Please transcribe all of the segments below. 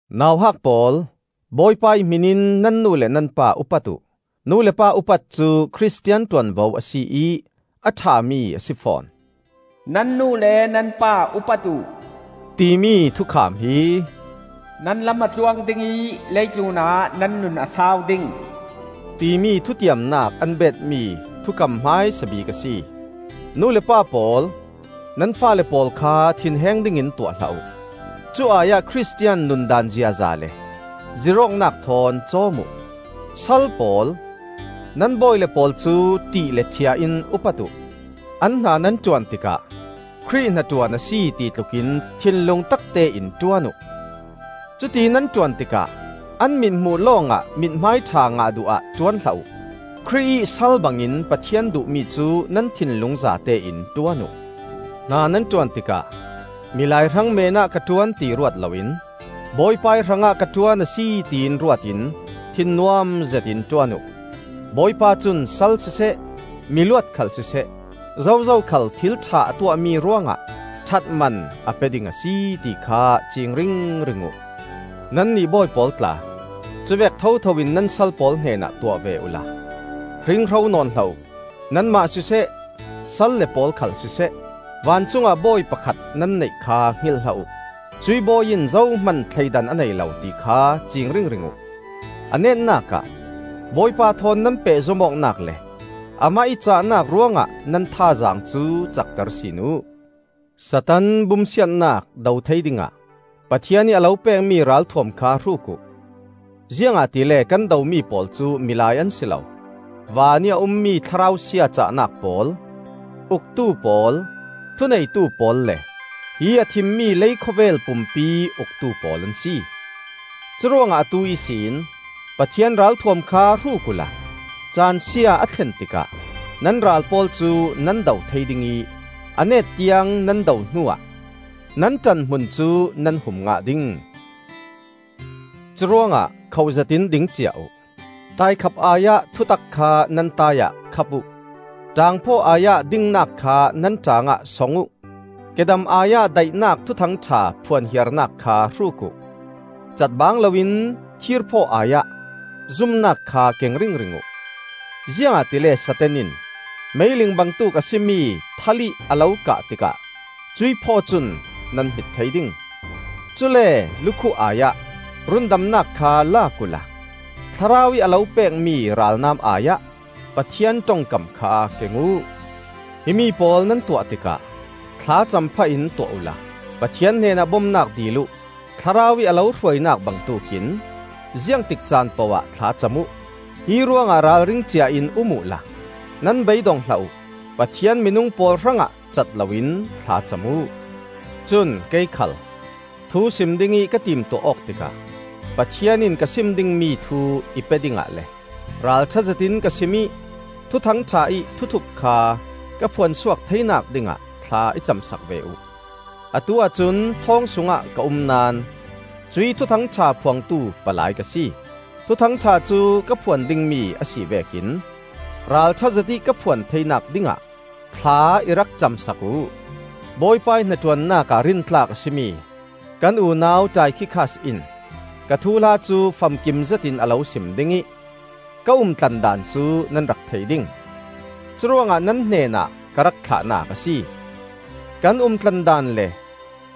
Nauhak pawl, Bawipa ih hmin in nan nu le nan pa upat uh. Nu le pa upat cu Khristian ṭuanvo a si ih a ṭhami a si fawn. “Nan nu le nan pa upat uh,” timi thukham hi, “Na lam a tluang ding ih leitlunah na nun a sau ding,” timi thutiamnak an beetmi thukam hmaisa bik a si. Nu le pa pawl, nan faale pawl kha thinheng dingin tuah hlah uh. Cu ai-ah Khristian nundaan ziaza le zirh awknak thawn cawm uh. Sal pawl, nan bawile pawl cu ṭih le ṭhia in upat uh. An hna nan ṭuan tikah Khrih hnaṭuan a si ti tlukin thinlung taktein ṭuan uh. Cuti nan ṭuan tikah an mithmuh lawngah mithmaiṭha ngah duh ah ṭuan hlah uh. Khrih ih sal bangin Pathian duhmi cu nan thinlung zatein ṭuan uh. Hna nan ṭuan tikah milai hrang meenah ka ṭuan ti ruat loin Bawipa ih hrangah ka ṭuan a si tiin ruat in thinnuam zetin ṭuan uh. Bawipa cun sal siseh, miluat khal siseh, zozo khal thil ṭha a tuahmi ruangah ṭhatman a pe ding a si, ti kha ciing ringring uh. Nannih bawi pawl tla, cuvek thotho in nan sal pawl hnenah tuah ve uhla hringhro nawn hlah uh. Nanmah siseh, sal le pawl khal siseh, vancungah bawi pakhat nan neih kha hngilh hlah uh. Cuih bawi in zohman thleidan a nei lo, ti kha ciing ringring uh. A netnak ah, Bawipa thawn nan pehzom awknak le amah ih cahnak ruangah nan thazaang cu cakter sin uh. Satan bumsiatnak do thei dingah Pathian ih a lo pekmi ralthuam kha hruk uh. Ziangahtile kan domi pawl cu milai an si lo, vanih a ummi thlarau sia cahnak pawl, uktu pawl, thuneitu pawl, le hi a thimmi leikhawvel pumpi uktu pawl an si. Curuangah atu ihsin Pathian ralthuam kha hruk uhla caansia a thlen tikah nan ral pawl cu nan do thei ding ih a net tiang nan do hnuah nan ṭanhmun cu nan hum ngah ding. Curuangah khoh zetin ding cia uh: taikhap ai-ah thutak kha nan tai ah khap uh; ṭaangphaw ai-ah dingnak kha nan ṭaangah song uh; kedam ai-ah daihnak Thuthang ṭha phuan hiarnak kha hruk uh. Catbangloin thirphaw ai-ah zumnak kha keng ringring uh; ziangahtile Satan in meiling bangtuk a si mi thal ih a lo kah tikah cuih phaw cun nan hmit thei ding. Cule lukhuh ai-ah rundamnak kha lak uhla Thlarau ih a lo pekmi ralnam ai-ah Pathian ṭongkam kha keng uh. Himi pawl nan tuah tikah thlacam phah in tuah uhla Pathian hnenah bomnak dil uh. Thlarau ih a lo hruainak bangtuk in ziangtik caan pohah thlacam uh. Hi ruangah ralring cia in um uh la nan beidong hlah uh. Pathian minung pawl hrangah cat loin thlacam uh. Cun kei khal thusim dingih ka timtuah awk tikah Pathian in ka sim dingmi thu i pe dingah le ralṭha zetin ka sim ih Thuthang ṭha ih thuthup kha ka phuansuak theinak dingah thla i cam sak ve uh. Atuah cun thawng sungah ka um naón cuih Thuthang ṭha phuangtu palai ka si. Thuthang ṭha cu ka phuan dingmi a si vekin ralṭha zetih ka phuan theinak dingah thla i rak cam sak uh. Bawipa ih hnaṭuannak ah rintlak a si mi kan unau Taikhikas in ka thuhla cu famkim zetin a lo sim ding ih ka umtlandan cu nan rak thei ding. Curuangah nan hnenah ka rak thlahnak a si. Kan umtlandan le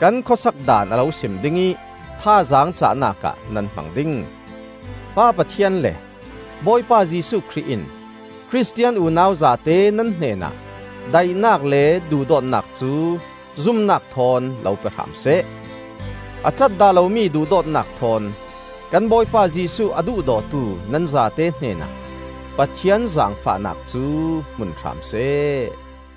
kan khuasak daan a lo sim ding ih thazaang cahnak ah nan hmang ding. Pa Pathian le Bawipa Jesuh Khrih in Khristian unau zate nan hnenah daihnak le duhdawtnak cu zumnak thawn lo pe hram seh. A cat dah lomi duhdawtnak thawn kan Bawipa Jesuh a duhdawtu nan zate hnenah Pathian zaangfahnak cu hmun hram seh.